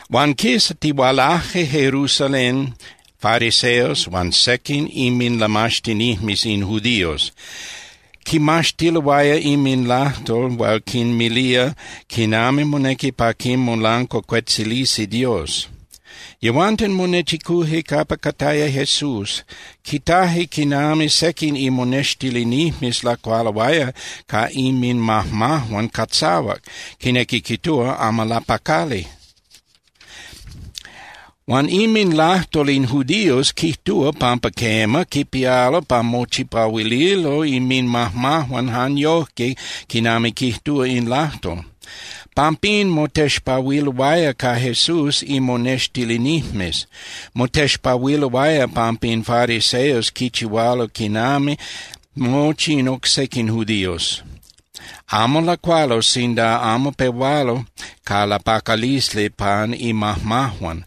Huan quistihualaje Jerusalén fariseos huan sequin inminlamaxtinijmes in judíos, quimaxtiloaya inminlajtol hual quinmilía quinami monequi pa quimolancuacuetzilisi Dios. Yehuanten monechicuje capa cataya Jesús. Quitaje quinami sequin imonextilinijmes lacualoaya ca inminmajmajuan catzahuac, quinequi quijtúa amo lapacali. Huan inminlajtol in judíos quijtúa pampa quema, quipialo pa mochipahuililo inminmajmajuan jan yojque quinami quijtúa in lajtol. Pampín motexpahuiloaya ca Jesús imonextilinijmes. (Motexpahuiloaya pampa in fariseos quichihualo quinami mochi in oc sequin judíos. Amo lacualo sinda amo pehualo ca lapacalisli pan inmajmajuan.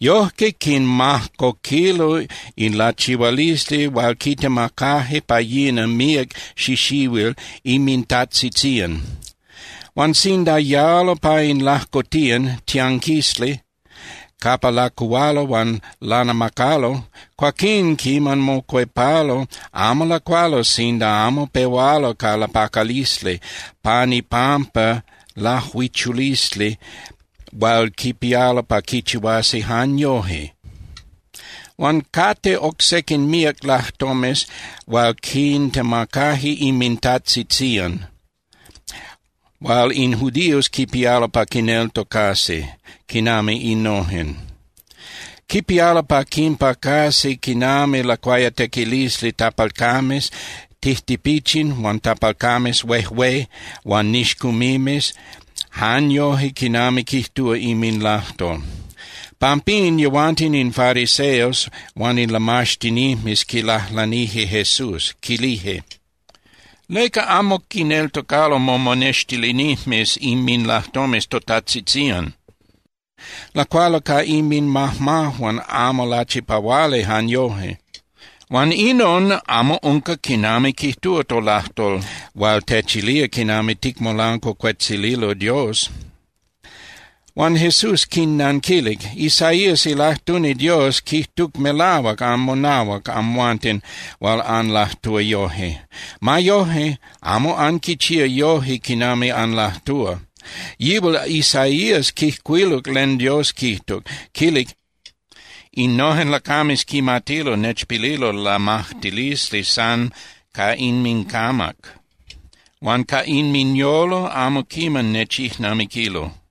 Yojque quinmajcoquilo in lachihualisli hual quitemacaje pa yina míac xixihuil inmintajtzitzían. Huan sinda yalo pa in lajcotiyan (tianquisli) capa lacuhualo huan lanamacalo, cuaquín quiman mocuepalo, amo lacualo sinda amo pehualo ca lapacalisli pan ipampa lajuichulisli hual quipialo pa quichihuasi jan yoje. Huan cate oc sequin míac lajtomes hual quintemacaje inmintajtzitzían, hual in judíos quipialo pa quineltocasi, quinami innojen: Quipialo pa quinpacasi quinami lacuayatequilisli tapalcames tijtipichin huan tapalcames huejué huan nixcumimes jan yoje quinami quijtúa inminlajtol.) Pampín yehuanten in fariseos huan in lamaxtinijmes quilajlanije Jesús, quilije: —¿Leca amo quineltocalo momonextilinijmes inminlajtomes totajtzitzían? Lacualo ca inminmajmajuan amo lachipahuali jan yoje, huan inon amo unca quinami quijtúa tolajtol hual techilía quinami ticmolancuacuetzililo Dios. Huan Jesús quinnanquilic: —Isaías ilajtuni Dios quijtuc melahuac anmonahuac amhuanten hual anlajtúa yoje. Ma yoje, amo anquichía yoje quinami anlajtúa. Yihual Isaías quijcuiluc len Dios quijtuc, quilic: Innojen lacames quimatilo nechpililo lamajtilisli san ca inmincamac, huan ca inminyolo amo quiman nechijnamiquilo.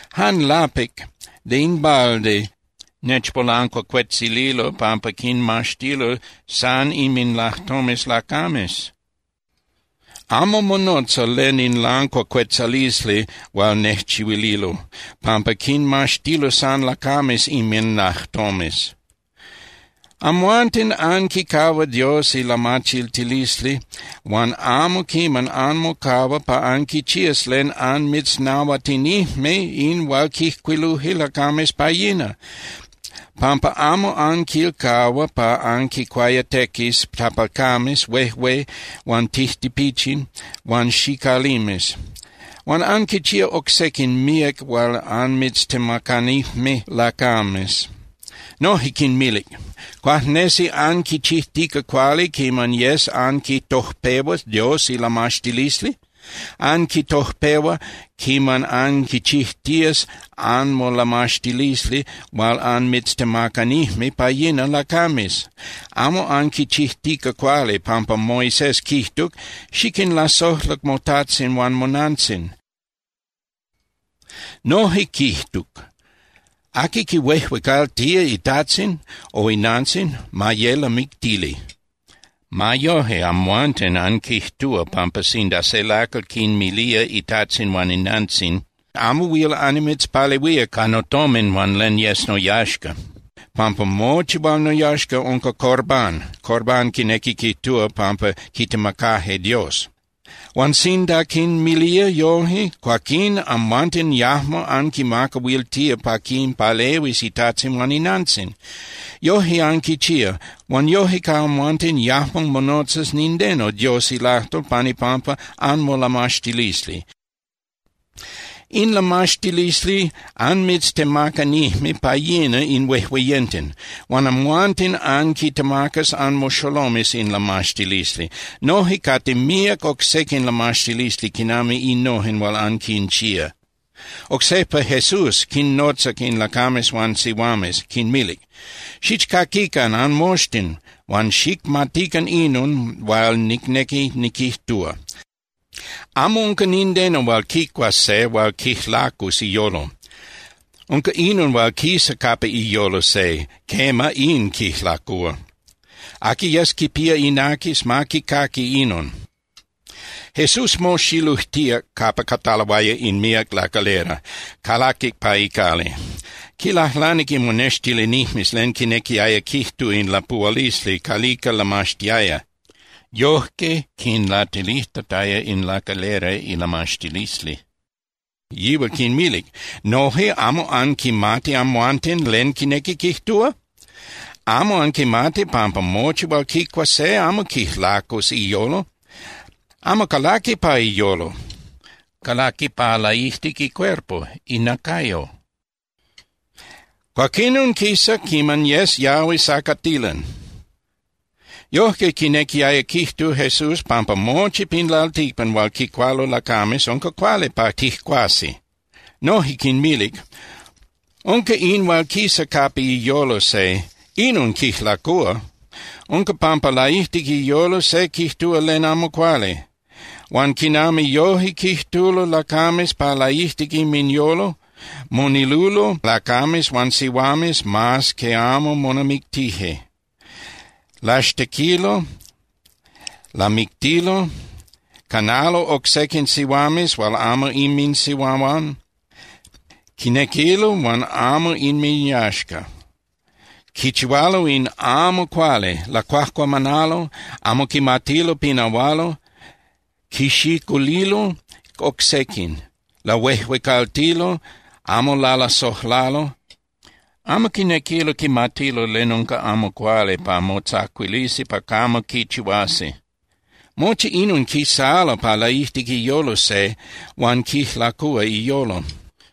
Jan lapic (de in balde) nechmolancuacuetzililo pampa quinmaxtilo san inminlajtomes lacames. Amo monotza len in lancuacuetzalisli hual nejchihuililo, pampa quinmaxtilo san lacames inminlajtomes. Amhuanten anquicahua Dios ilamachiltilisli huan amo quiman anmocahua pa anquichías len anmitznahuatinijme in hual quijcuiluje lacames pa yina, pampa amo anquilcahua pa anquincuayatequis tapalcames huejué huan tijtipichin huan xicalimes. Huan anquinchía oc sequin míac hual anmitztemacanijme lacames. Noje quinmilic: —¿Cuajnesi anquichijtica cuali quiman yes anquitojpehua Dios ilamaxtilisli? Anquitojpehua quiman anquichijtías anmolamaxtilisli hual anmitztemacanijme pa yina lacames. Amo anquichijtica cuali, pampa Moisés quijtuc: “Xiquinlasojla motajtzin huan monantzin.” Noje quijtuc: “Aqui quihuejuecaltía itajtzin o inantzin, ma ye lamictili.” Ma yoje, amhuanten anquijtúa pampa sinda se lacal quinmilía itajtzin huan inantzin: “Amo huil annimitzpalehuía ca notomin huan len yes noyaxca, pampa mochi hual noyaxca unca Corbán.” (Corbán quinequi quijtúa pampa quitemacaje Dios.) Huan sinda quinmilía yoje, cuaquín amhuanten yajmo anquimacahuiltía pa quinpalehuis itajtzin huan inantzin. Yoje anquichía. Huan yoje ca amhuanten yajmo monotzas nindeno Dios ilajtol pan ipampa anmolamaxtilisli. In lamaxtilisli anmitztemacanijme pa yina in huejueyenten. Huan amhuanten anquintemacas anmoxolomes in lamaxtilisli. Noje cate míac oc sequin lamaxtilisli quinami innojen hual anquinchía. Oc sejpa Jesús quinnotzac in lacames huan sihuames, quinmilic: —Xichcaquican anmoxtin huan xicmatican inon hual nicnequi niquijtúa. Amo unca nindeno hual quicuas se hual quijlacus iyolo. Unca inon hual quisa capa iyolo se, quema, in quijlacúa. Aqui yes quipía inacas, ma quicaqui inon. Jesús moxilujtíac capa cataloaya in míac lacalera, calaquic pa icali. Quilajlanije imonextilinijmes len quinequiaya quijtu in lapuhualisli calica lamaxtiaya, yojque quinlatilijtataya in lacalera ilamaxtilisli. Yihual quinmilic: —¿Noje amo anquimati amhuanten len quinequi quijtúa? ¿Amo anquimati pampa mochi hual quicua se amo quijlacus iyolo? Amo calaqui pa iyolo, calaqui pa laijtic icuerpo (inacayo), cuaquinon quisa quiman yes yahui sacatilan. Yojque quinequiaya quijtu Jesús pampa mochi pin lalticpan hual quicualo lacames unca cuali pa tijcuasi. Noje quinmilic: —Unca in hual quisa capa iyolo se, inon quijlacúa. Unca pampa laijtic iyolo se quijtúa len amo cuali. Huan quinami yoje quijtulo lacames pa laijtic inminyolo, monilulo lacames huan sihuames mas que amo monamictije. Laxtequilo, lamictilo, canalo oc sequin sihuames hual amo inminsihuahuan, quinequilo hual amo inminyaxca. Quichihualo in amo cuali, lacuajcuamanalo, amo quimatilo pinahualo, quixiculilo oc sequin. Lahuejuecaltilo, amo lalasojlalo, amo quinequilo quimatilo len unca amo cuali pa motzacuilisi pa camo quichihuasi. Mochi inon quisalo pa laijtic iyolo se huan quijlacúa iyolo.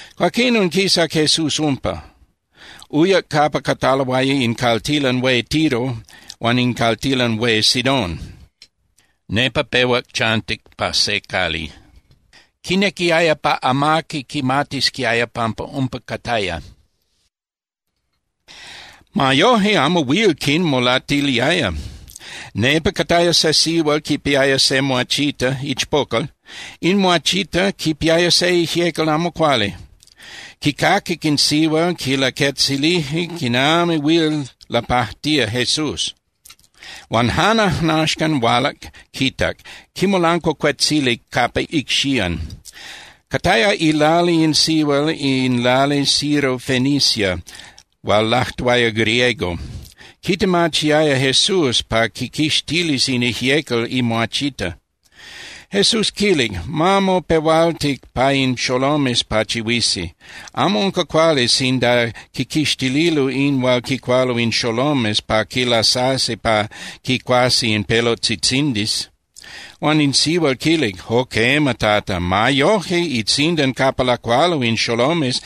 Cuaquinon quisac Jesús umpa, uyac capa cataloaya in caltilan hué Tiro huan in caltilan hué Sidón. Nepa pehuac chantic pa se cali. Quinequiaya pa amaqui quimatisquiaya pampa umpa cataya. Ma yoje, amo huil quinmolatiliaya. Nepa cataya se sihual quipiaya se muachita (ichpocal). In muachita quipiaya se ijyecal amo cuali. Quicaquic in sihual quilaquetzilije quinami huil lapajtía Jesús, huan jan ajnaxcan hualac quitac, quimolancuacuetzilic capa icxían. Cataya ilali in sihual in lali Sirofenicia huan lajtuaya griego. Quitemachiaya Jesús pa quiquixtilis in ijyecal imuachita. Jesús quilic: —Ma mopehualti pa in xolomes pachihuisi. Amo unca cuali sinda quiquixtililo in hual quicualo in xolomes pa quilasasi pa quicuasi in pelotzitzindis. Huan in sihual quilic: —Jo quema, Tata. Ma yojque itzindan capa lacualo in xolomes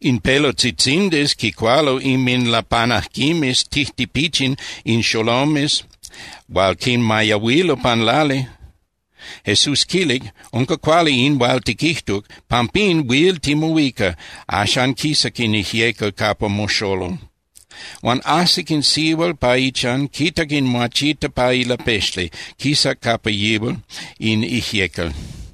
in pelotzitzindis quicualo inminlapanajquimes tijtipichin in xolomes hual quinmayahuilo pan lali. Jesús quilic: —Unca cuali in hual tiquijtuc. Pampín, huil timohuica, axan quisac in ijyecal capa moxolol. Huan ajsic in sihual pa ichan, quitac in muachita pa ilapexli, quisac capa yihual in ijyecal.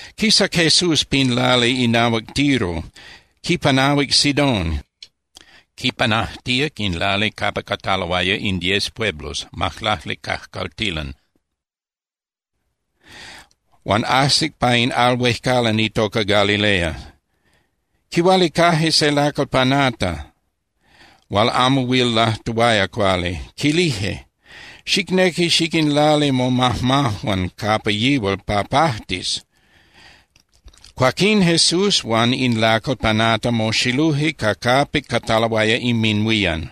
Quisac Jesús pin lali inahuac Tiro, quipanahuic Sidón, quipanajtíac in lali capa cataloaya in Diez Pueblos (Majlacli Cajcaltilan), huan ajsic pa in al huejcalan itoca Galilea. Quihualicaje se lacal panata hual amo huil lajtuaya cuali. Quilije: —Xicnequi xiquinlali momajmajuan capa yihual pa pajtis. Cuaquín Jesús huan in lacal panata moxiluje ca capic cataloaya inminhuían.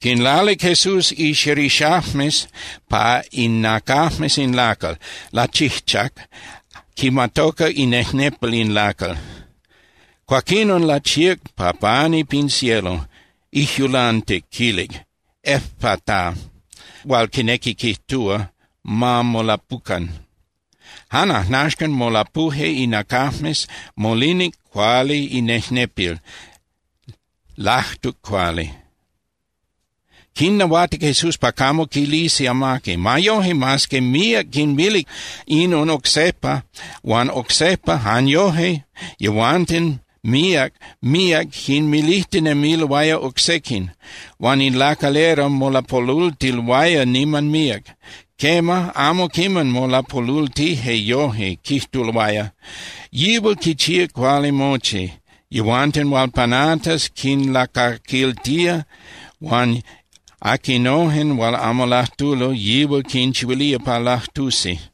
Quinlalic Jesús ixerixajmes pa inacajmes in lacal, lachijchac, quimatocac inejnepil in lacal. Cuaquinon lachíac pa pani pin cielo, ijyulantic, quilic: —¡Efata! —hual quinequi quijtúa: ¡Ma molapucan! Jan ajnaxcan molapuje inacajmes, molinic cuali inejnepil, lajtuc cuali. Quinnahuatic Jesús pa camo quilisi amaqui. Ma yoje, mas que míac quinmilic inon oc sejpa huan oc sejpa, jan yoje yehuanten míac, míac quinmilijtinemiloaya oc sequin. Huan in lacalera molapolultiloaya niman míac. Quema, amo quiman molapolultije yoje, quijtuloaya: —Yihual quichía cuali mochi. Yehuanten hual panatas quinlacaquiltía, huan aquinojen hual amo lajtulo, yihual quinchihuilía pa lajtusi.